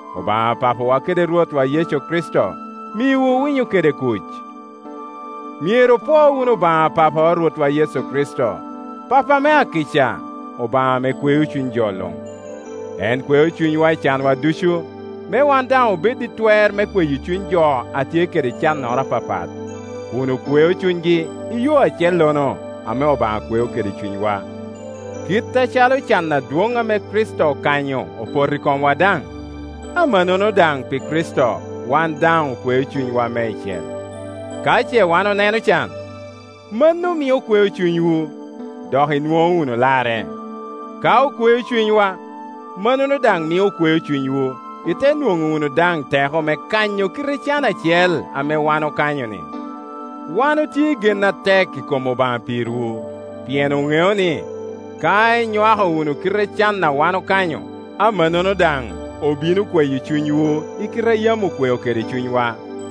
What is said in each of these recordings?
Obaŋ Papawa kede Rwotwa Yecu Kricito miwu winyo kede kuc. Myero opwoo wunu Obaŋa Papa a Rwotwa Yecu Kricito, Papo ame akica, Obaŋa ame kweo cuny jo luŋ. En kweo cunywa i canwa ducu, me wan daŋ obed i twer me kweyo cuny jo a tye kede cannoro apapat, kun okweo cunygi i yo acellono ame Obaŋa kweo kede cunywa. Kit acalo can adwoŋ ame Kricito okanyo opoto i komwa daŋ, amannono daŋ pi Kricito wan daŋ okweo cunywa meicel. Ka ce wan oneno can, mano mio okweo cunywu, dok inwoŋo wunu larre; ka okweo cunywa, mannono daŋ mio okweo cunywu, ite nwoŋo wunu daŋ teko me kanyo kite can acel ame wan okanyo-ni. Wan otye i gen atek i kom Obaŋa pirwu; pien oŋeo ni, ka inywako wunu kite can a wan okanyo, amannono daŋ obino kweyo cunywu i kite a yam okweo kede cunywa.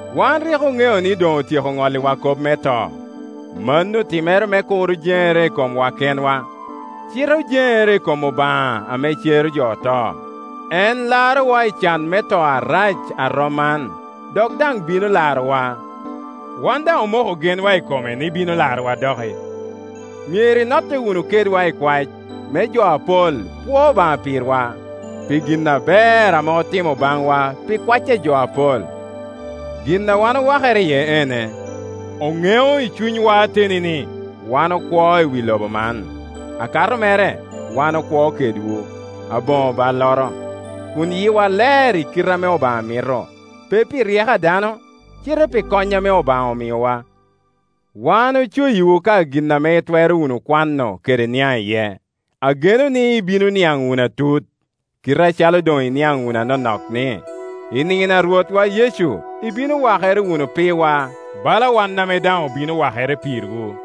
Wan rik oŋeo ni doŋ otyeko ŋolliwa kop me to. Mano otimere me kur ojeŋere i komwa kenwa, cite ojeŋere i kom Obaŋa ame cero jo oto. En larowa i can me to arac a rom man, dok daŋ bino larowa; wan daŋ omoko genwa i kome ni bino larowa doki. Myero inotte wunu kedwa i kwac, me jo apol pwo Obaŋa pirwa, pi gin aber ame otimo baŋwa pi kwac a jo apol. Gin a wan owakere iye ene: oŋeo i cunywa ateni ni wan okwo i wi lobo man, akato mere wan okwo kedwu, aboŋo balloro, kun yiwa ler i kite ame Obaŋa mito, pe pi ryeko a dano, cite pi kony ame Obaŋa omiowa. Wan ocoyiwu ka gin ame itwero wunu kwano kede niaŋ iye. Ageno ni ibino niaŋ wunu atut, kite acalo doŋ iniaŋ wunu anonok ni, i nino a Rwotwa Yecu ibino wakere wunu pirwa bala wan ame daŋ obino wakere pirwu.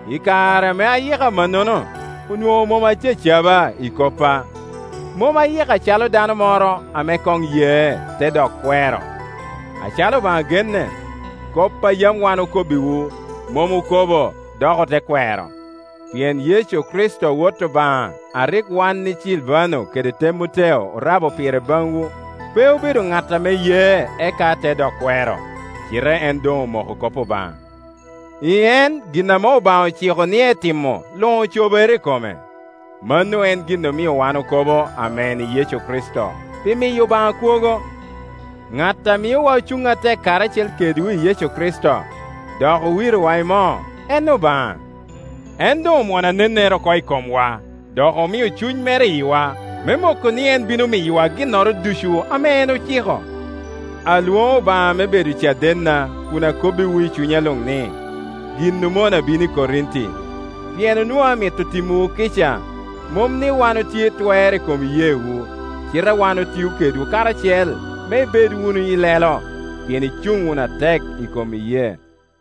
I kare ame ayiko amannono onwoŋo mom acacaba i koppa. Mom ayiko acalo dano moro ame koŋ ye, te dok kwero. Acalo Obaŋa genne, kop a yam wan okobbiwu mom okobo ote dok kwero. Pien Yecu Kricito Wot Obaŋa a rik wan i Cilvano kede Temoteo orabo pire baŋwu pe obedo ŋat ame ye eka te dok kwero, cite en doŋ omoko kop Obaŋa; i en gin ame Obaŋa ociko ni etimo luŋ ocobere i kome. Mano en gin omio wan okobo Amen i Yecu Kricito pi miyo Obaŋa kwogo. Ŋat a miowa Ocuŋ atek karacel kedwu i Yecu Kricito, dok owirowa i moo, en Obaŋa. En doŋ omwono anennere oko i komwa, dok omio Cuny mere i yiwa, me moko ni en bino miyowa ginnoro ducu ame en ociko. Alwoŋo Obaŋa me bedo cadenna kun akobbiwu i cunya luŋ ni, gin omona bino i Korinti, pien onwoŋo amito timowu kica. Mom ni wan otye i twer i kom iyeewu, cite wan otio kedwu karacel me ibed wunu ilelo, pien icuŋ wunu atek i kom iyee.